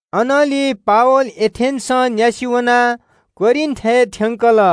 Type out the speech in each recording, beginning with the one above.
अनंलि पावल एथेन्‍सं न्‍यासि वनाः कोरिन्‍थय् थ्‍यंकः वल।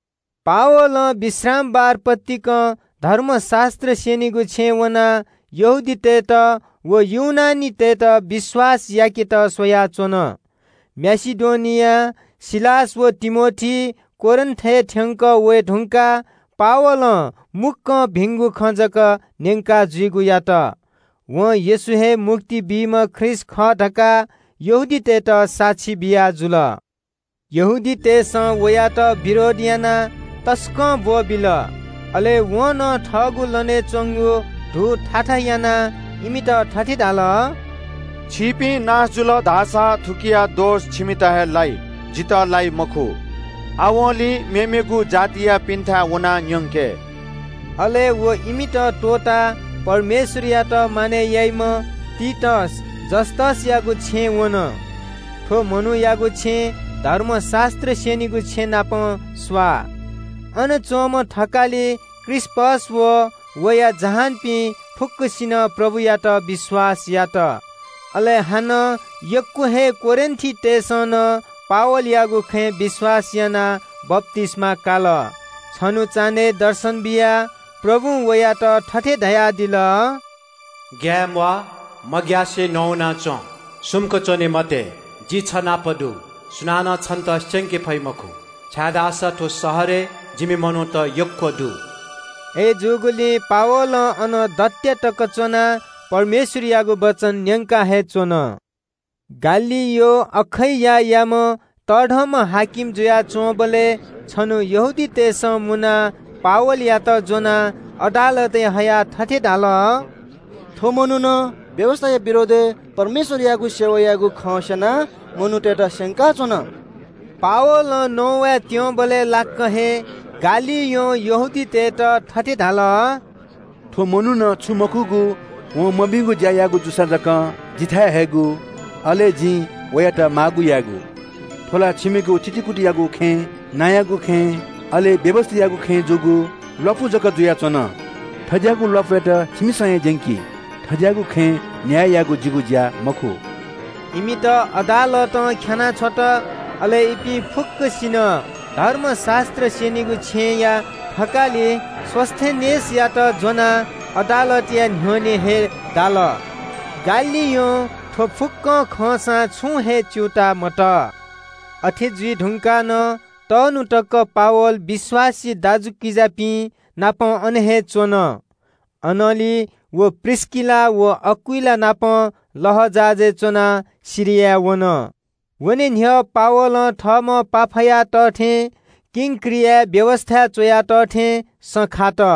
पावलं विश्रामबार पतिकं धर्मशास्‍त्र स्‍यनीगु छेँय् वनाः यहूदीतय् नायःतय्‌त व ग्रीकतय्‌त विश्‍वास याकेत स्‍वयाच्‍वन। माकेडोनियां सिलास व तिमोथी कोरिन्‍थय् थ्‍यंकः वये धुंकाः पावलं मुक्‍कं भिंगु खँ जक न्‍यंका जुइगु यात। वं येशू हे मुक्ति बीम्‍ह ख्रीष्‍ट खः धकाः यहूदीतय्‌त साक्षी बियाजुल। यहूदीतय् नायःतय्‌सं वयात विरोध यानाः तसकं बेइज्‍जत यात। अले वं थःगु लनय् च्‍वंगु धू थाथा यानाः इमित थथे धाल – “छिकपिं नाश जुल धाःसा थुकिया दोष छिकपिन्‍त हे लाइ, जितः लाइ मखु। आवंलि यहूदीमखुपिन्‍थाय् वनाः न्‍यंके।” अले व इमित त्‍वःताः परमेश्‍वरयात मानय् याइम्‍ह तीतस युस्‍तसयागु छेँय् वन। थ्‍व मनूयागु छेँ धर्मशास्‍त्र स्‍यनीगु छेँ नाप स्‍वाः। अन च्‍वंम्‍ह कजी क्रिस्‍पस व वया जहानपिं फुक्‍कसिनं प्रभुयात विश्‍वास यात। अले हानं यक्‍व हे कोरिन्‍थीतय्‌सं पावलयागु खँ न्‍यनाः विश्‍वास यानाः बप्‍तिस्‍मा काल। छन्‍हु चान्‍हय् दर्शन बियाः प्रभुं पावलयात थथे धयादिल – “ग्‍याये म्‍वाः, मग्‍यासे नवाना च्‍वँ, सुम्‍क च्‍वने मते। जि छ नाप दु। सुनानं छन्‍त स्‍यंके फइ मखु, छाय्‌धाःसा थ्‍व शहरय् जिमि मनूत यक्‍व दु।” अय्‌जूगुलिं पावलं अन दत्‍या तक च्‍वनाः परमेश्‍वरयागु वचन न्‍यंका हे च्‍वन। गलियोन अखैयायाम्‍ह तःधंम्‍ह शासक जुयाच्‍वंबलय् छन्‍हु यहूदीतय् नायःतय्‌सं मुनाः पावलयात ज्‍वनाः अदालतय् हयाः थथे धाल – “थ्‍व मनुखं व्‍यवस्‍थाया विरोधय् परमेश्‍वरयागु सेवा यायेगु खँ स्‍यनाः मनूतय्‌त स्‍यंकाच्‍वन।” पावलं नवाये त्‍यंबलय् लाक्‍क हे गलियोनं यहूदीतय् नायःतय्‌त थथे धाल – “थ्‍व मनुखं छुं मखुगु व मभिंगु ज्‍या याःगु जूसा जकं जिथाय् हयेगु, अले जिं वयात माःगु यायेगु। थ्‍व ला छिमिगु थितिकुतियागु खँय्, नांयागु खँय्, अले व्‍यवस्‍थायागु खँय् जूगु ल्‍वापु जक जुयाच्‍वन। थज्‍याःगु ल्‍वापुयात छिमिसं हे ज्‍यंकी। थज्‍याःगु खँय् न्‍याय यायेगु जिगु ज्‍या मखु।” इमित अदालतं ख्‍यानाः छ्वल। अले इपिं फुक्‍कसिनं धर्मशास्‍त्र स्‍यनीगु छेँया थकालि सोस्‍थेनेसयात ज्‍वनाः अदालतया न्‍ह्यःने हे दाल। गलियोनं थ्‍व फुक्‍क खंसां छुं हे च्‍यूताः मतः। अथे जुइ धुंकाः नं तःन्‍हु तक पावल विश्‍वासी दाजुकिजापिं नाप अन हे च्‍वन। अले पावल, प्रिस्‍किला व अकिलास नाप लःजहाजय् च्‍वनाः सिरियापाखे वन। वने न्‍ह्यः पावलं थःम्‍हं भाकल याःथें किंक्रियाय् सँ खात।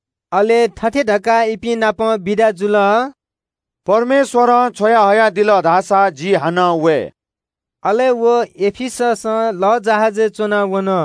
अले थथे धकाः इपिं नाप बिदा जुल – “परमेश्‍वरं छ्वयाहयादिल धाःसा जि हानं वये।” अले व एफिससं लःजहाजय् च्‍वनाः वन।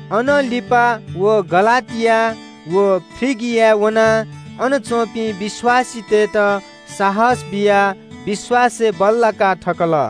लिपा व हानं गलातिया व फ्रिगिया वनाः थाय् थासय् च्‍वंपिं विश्‍वासीतय्‌त साहस बियाः विश्‍वासय् बल्‍लाका थकल।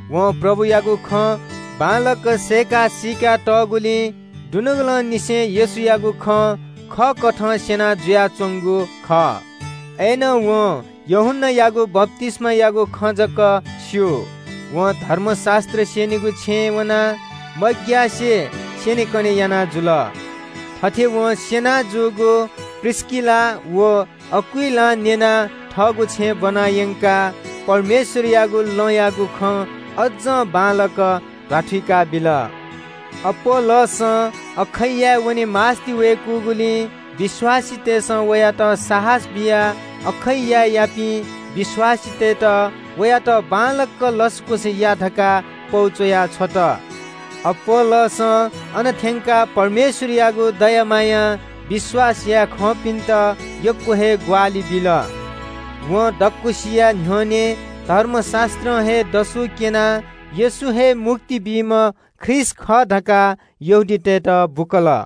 वं प्रभुयागु खँ बांलाक सय्‌का सीका तःगुलिं दुनुगलंनिसें येशूयागु खँ खःकथं स्‍यना जुयाच्‍वंगु खः। अय्‌नं वं यूहन्‍नायागु बप्‍तिस्‍मायागु खँ जक स्‍यू। वं धर्मशास्‍त्र स्‍यनीगु छेँय् वनाः मग्‍यासे स्‍यनेकने याना जुल। थथे वं स्‍यना जूगु प्रिस्‍किला व अकिलासं न्‍यनाः वयात थःगु छेँय् ब्‍वना यंकाः परमेश्‍वरयागु लँयागु खँ अज्‍जं बांलाक ध्‍वाथुइका बिल। अपोल्‍लोसं अखैयाय् वने मास्‍ति वय्‌कूगुलिं विश्‍वासीतय्‌सं वयात साहस बियाः अखैयायापिं विश्‍वासीतय्‌त वयात बांलाक लसकुस या धकाः पौ च्‍वया छ्वल। अपोल्‍लोसं अन थ्‍यंकाः परमेश्‍वरयागु दया मायां विश्‍वास याये खंपिन्‍त यक्‍व हे ग्‍वाहालि बिल। वं दक्‍वसिया न्‍ह्यःने धर्मशास्‍त्रं हे दसु क्‍यनाः येशू हे मुक्ति बीम्‍ह ख्रीष्‍ट खः धकाः यहूदीतय्‌त बुकल।